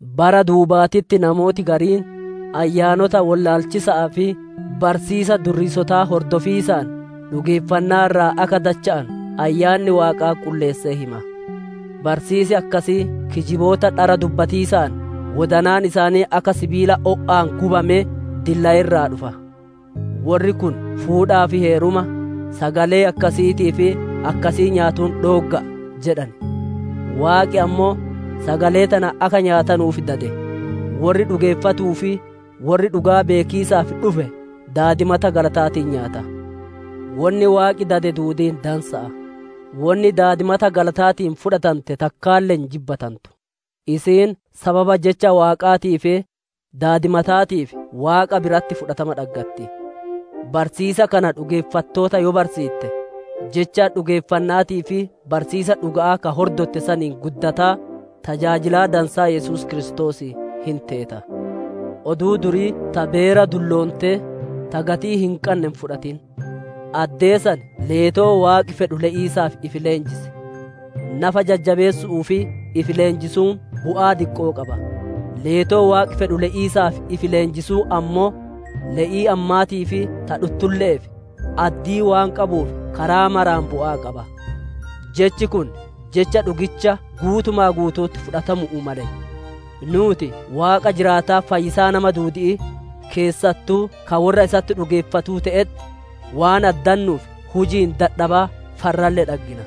Bara duubaatitti namooti gariin, ayyaanota wollaalchisa'aa fi barsiisa durriisotaa hordofiisaan dhugeeffannaa irraa akka dacha'anu Ayyaanni Waaqaa qulleessee hima. Barsiisi akkasii kijiboota dhara dubbatiisaan wodanaan isaanii akka sibiila o'aan gubamee dillaye irraa dhufa. Worri kun «Fuudhaa fi heeruma, sagalee akkasiitii fi akkasii nyaatuun dhoogga'a» jedhan. Waaqi ammoo, sagalee tana akka nyaatanuuf dade; worri dhugeeffatuu fi worri dhugaa beekiisaaf dhufe daadimata galataatiin nyaata. Wonni Waaqi dade duudiin dansa'a; wonni daadimata galataatiin fudhatante takkaalle hin jibbatantu, isiin sababa jecha Waaqaatii fi daadimataatiif Waaqa biratti fudhatama dhaggatti. Barsiisa kana dhugeeffattoota yoo barsiitte, jecha dhugeeffanna'aatii fi barsiisa dhuga'aa ka hordotte saniin guddataa, tajaajilaa dansaa Yesuus Kiristoosii hin teeta. Oduu durii ta beera dulloontee, ta gatii hin qanne hin fudhatin. Addee san leetoo Waaqi fedhuu le'iisaaf ifi leenjis. Nafa jajjabeessu'uuf ifi leenjisuun bu'aa diqqoo qaba; leetoo Waaqi fedhu le'iisaaf ifi leenjisuun ammoo, le'ii ammaatii fi ta dhuttulle'eef addii waan qabuuf karaa maraan bu'aa qaba. Jechi kun jecha dhugicha guutuma guutu'utti fudhatamu'uu male. Nuuti Waaqa jiraataa fayyisaa nama duudi'ii, keessattuu ka worra isatti dhugeeffatuu te'etti waan addannuuf huji'iin dadhabaa farralle dhaggina.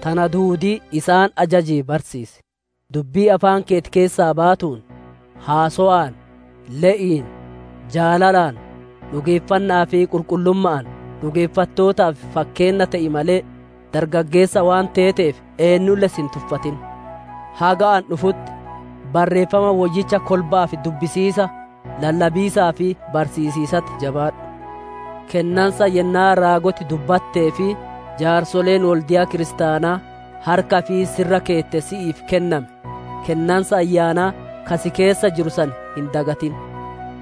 Tana duudii isaan ajajii barsiisi. Dubbii afaan keeti keessaa baatuun, haasowaan, le'iin, jaalalaan, dhugeeffanna'aa fi qulqullumma'aan dhugeeffattootaaf fakkeenna te'i malee, dargaggeessa waan teeteef eennulle si hin tuffatin. Haga ani dhufutti, Barreeffama Woyyicha kolba'aaf dubbisiisa, lallabiisaa fi barsiisiisatti jabaadhu. Kennansa yennaa raagoti dubbattee fi jaarsoleen wolde'a kiristaanaa harka ifii si irra keette si'iif kenname, kennansa Ayyaanaa ka si keessa jiru san hin dagatin.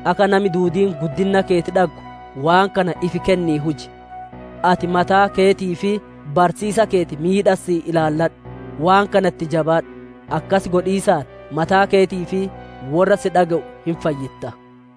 Akka nami duudiin guddinna keeti dhaggu waan kana ifi kennii huji. Ati mataa keetii fi barsiisa keeti midhassii ilaalladhu, waan kana itti jabaadhu; akkas godhiisaan mataa keetii fi worra si dhage'u hin fayyitta.